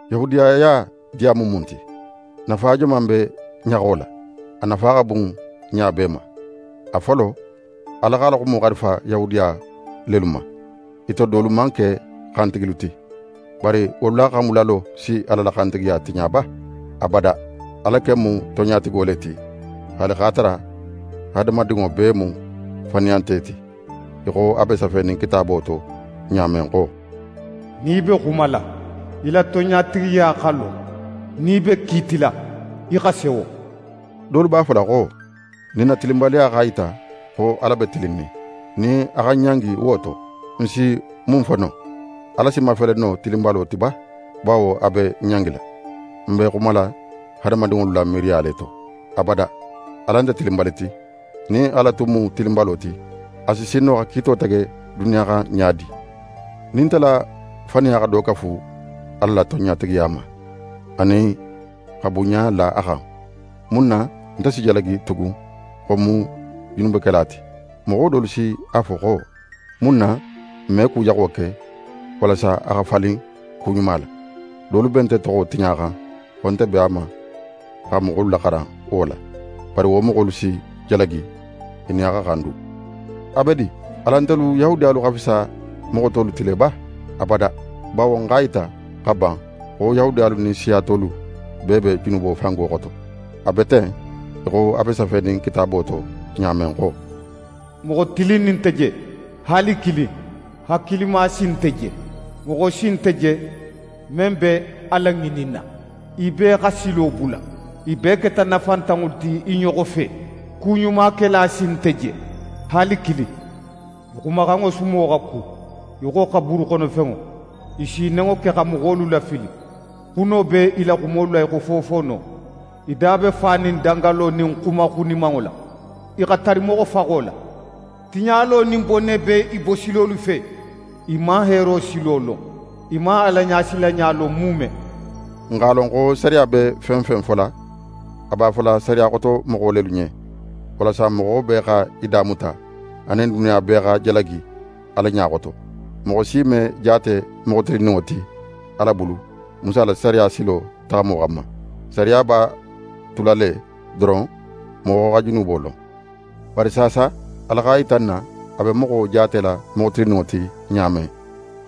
Yahudiyaya diya mu mun ti? Nafa joman be ɲaxo la? A nafa xa bun ɲa bee ma. A folo, Ala x'a la xumo xarifa Yahudiya lelu ma. I to dolu man ke xantigilu ti. Bari wolu la xanbulalo si Ala la xantigiya tiɲa ba? Abada! Ala ken mu tonɲatigo le ti, haali x'a tara hadamadinŋo bee mu faniyante ti, í xo a be safenin Kitaabo to ɲa men xo: «Nin í be xumala, í la tonɲatigiya xa lon; nin í be kiitila, í xa sewo.» Dolu b'a fola xo: «Nin n na tilinbaliya x'a yita xo Ala be tilinnin, nin a xa n ɲangi wo to, n si mun fo no? Ala si mafele no tilinbalo ti ba, bawo a be n ɲangila?» Ń be xumala hadamadinŋolu la miiriya le to. Abada! Ala nte tilinbali ti. Nin Ala tun mu tilinbalo ti, a si sin no xa kiito tege duniya xan ɲa di? Nin nte la faniya xa do kafu Ala la tonɲatigiya ma anin xa bunɲa la a xan, mun na nte si jalagi tugun xo ń mu junubekela ti? Moxo dolu si a fo xo: «Mun na n me ku jaxo ke, walasa a xa falin ku ɲuma la?» Dolu be nte toxo tiɲaxan xo nte b'a ma xa moxolu laxaran wo la. Bari wo moxolu si jalagi, i nin a xa xan du. A be di! Alan ntelu Yahudiyalu xa fisa moxo tolu ti le ba? Abada! Bawo ń x'a yita xa ban xo Yahudiyalu nin siya tolu bee be junubo fango xoto. A be ten, í xo a be safenin Kitaabo to ɲa men xo: «Moxo tilinnin nte je, haali kilin. Hakilima si nte je. Moxo si nte je men be Ala ŋininna. I bee xa silo bula. I bee keta nafantanŋolu ti i ɲoxo fe. Ku ɲumakela si nte je, haali kilin. I xumaxanŋo sumo xa ku í xo xaburu xono fenŋo. I s'i nenŋo ke xa moxolu lafili. Xuno be i la xumolu la í xo fofoono. I da be fanin dangalo nin xuma xunimanŋo la. I xa tari moxofaxo la. Tiɲalo nin bone be i bosilolu fe. I man heero silo lon. I man Alaɲasilanɲa lon muume.» N x'a lon xo sariya be fen fen fola, a b'a fola sariya xotomoxo lelu ɲen; walasa moxo bee xa í da muta anin duniya bee xa jalagi Ala ɲa xoto. Moxo si me jaate moxo tilinninŋo ti Ala bulu Musa la sariya silo taxamo xanma. Sariya b'a tula le doron, moxo xa junubo lon. Bari saasa, Ala x'a yita n na, a be moxo jaatela moxo tilinninŋo ti ɲa men,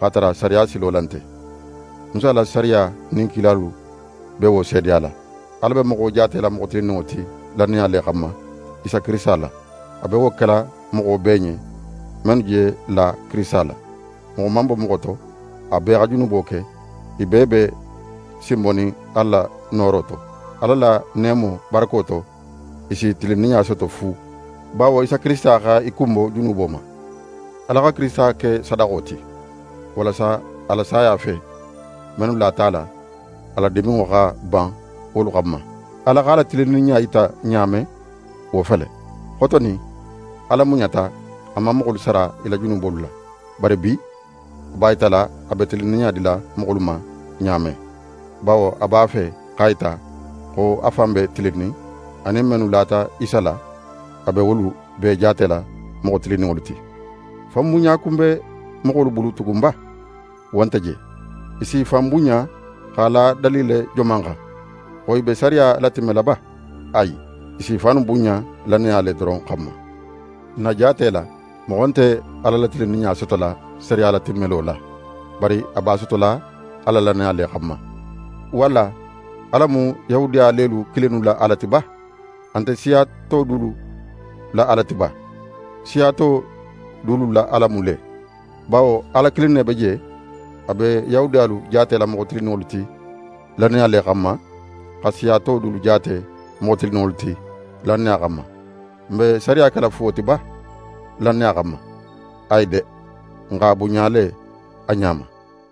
x'a tara sariya silo la nte. Musa la sariya nin kilalu be wo seedeyala: Ala be moxo jaatela moxo tilinninŋo ti lannaya le xanma, Isa Kirisita la. A be wo kela moxo bee ɲen, mennu je la Kirisita la. Moxo man bo moxo to, a bee xa junubo ke. I bee be sinbonin Ala nooro to. Ala la neemo barako to, i si tilinninɲa soto fu, bawo Isa Kirisita xa i kunbo junubo ma. Ala xa Kirisita ke sadaxo ti, walasa a la saya fe, mennu lata a la, a la diminŋo xa ban wolu xanma. Ala x'a la tilinninɲa yita ɲa men, wo fele: Xotonin, Ala muɲata, a man moxolu sara i la junubolu la. Bari bi, a b'a yitala, a be tilinninɲa dila moxolu ma ɲa men; bawo a b'a fe x'a yita xo a fan be tilinnin, anin mennu lata Isa la, a be wolu bee jaatela moxo tilinninŋolu ti. Fanbunɲa kun be moxolu bulu tugun ba? Wo nte je! I s'i fan bunɲa x'a la dalile joman xan? Xo i be sariya latimmela ba? Ayi! I s'i fannu bunɲa lannaya le doron xanma. N na jaate la, moxo nte Ala la tilinninɲa sotola sariya latimmelo la, bari a b'a sotola a la lannaya le xanma. Walla Ala mu Yahudiya lelu kilinnu la Ala ti ba? A nte siya to dulu la Ala ti ba? Siya to dulu la Ala mu le; bawo Ala kilin ne be je. A be Yahudiyalu jaatela moxo tilinninŋolu ti lannaya le xanma, xa siya to dulu jaate moxo tilinninŋolu ti lannaya xanma. N be sariya kela fuwo ti ba, lannaya xanma? Ayi de! N x'a bunɲa le a ɲa ma.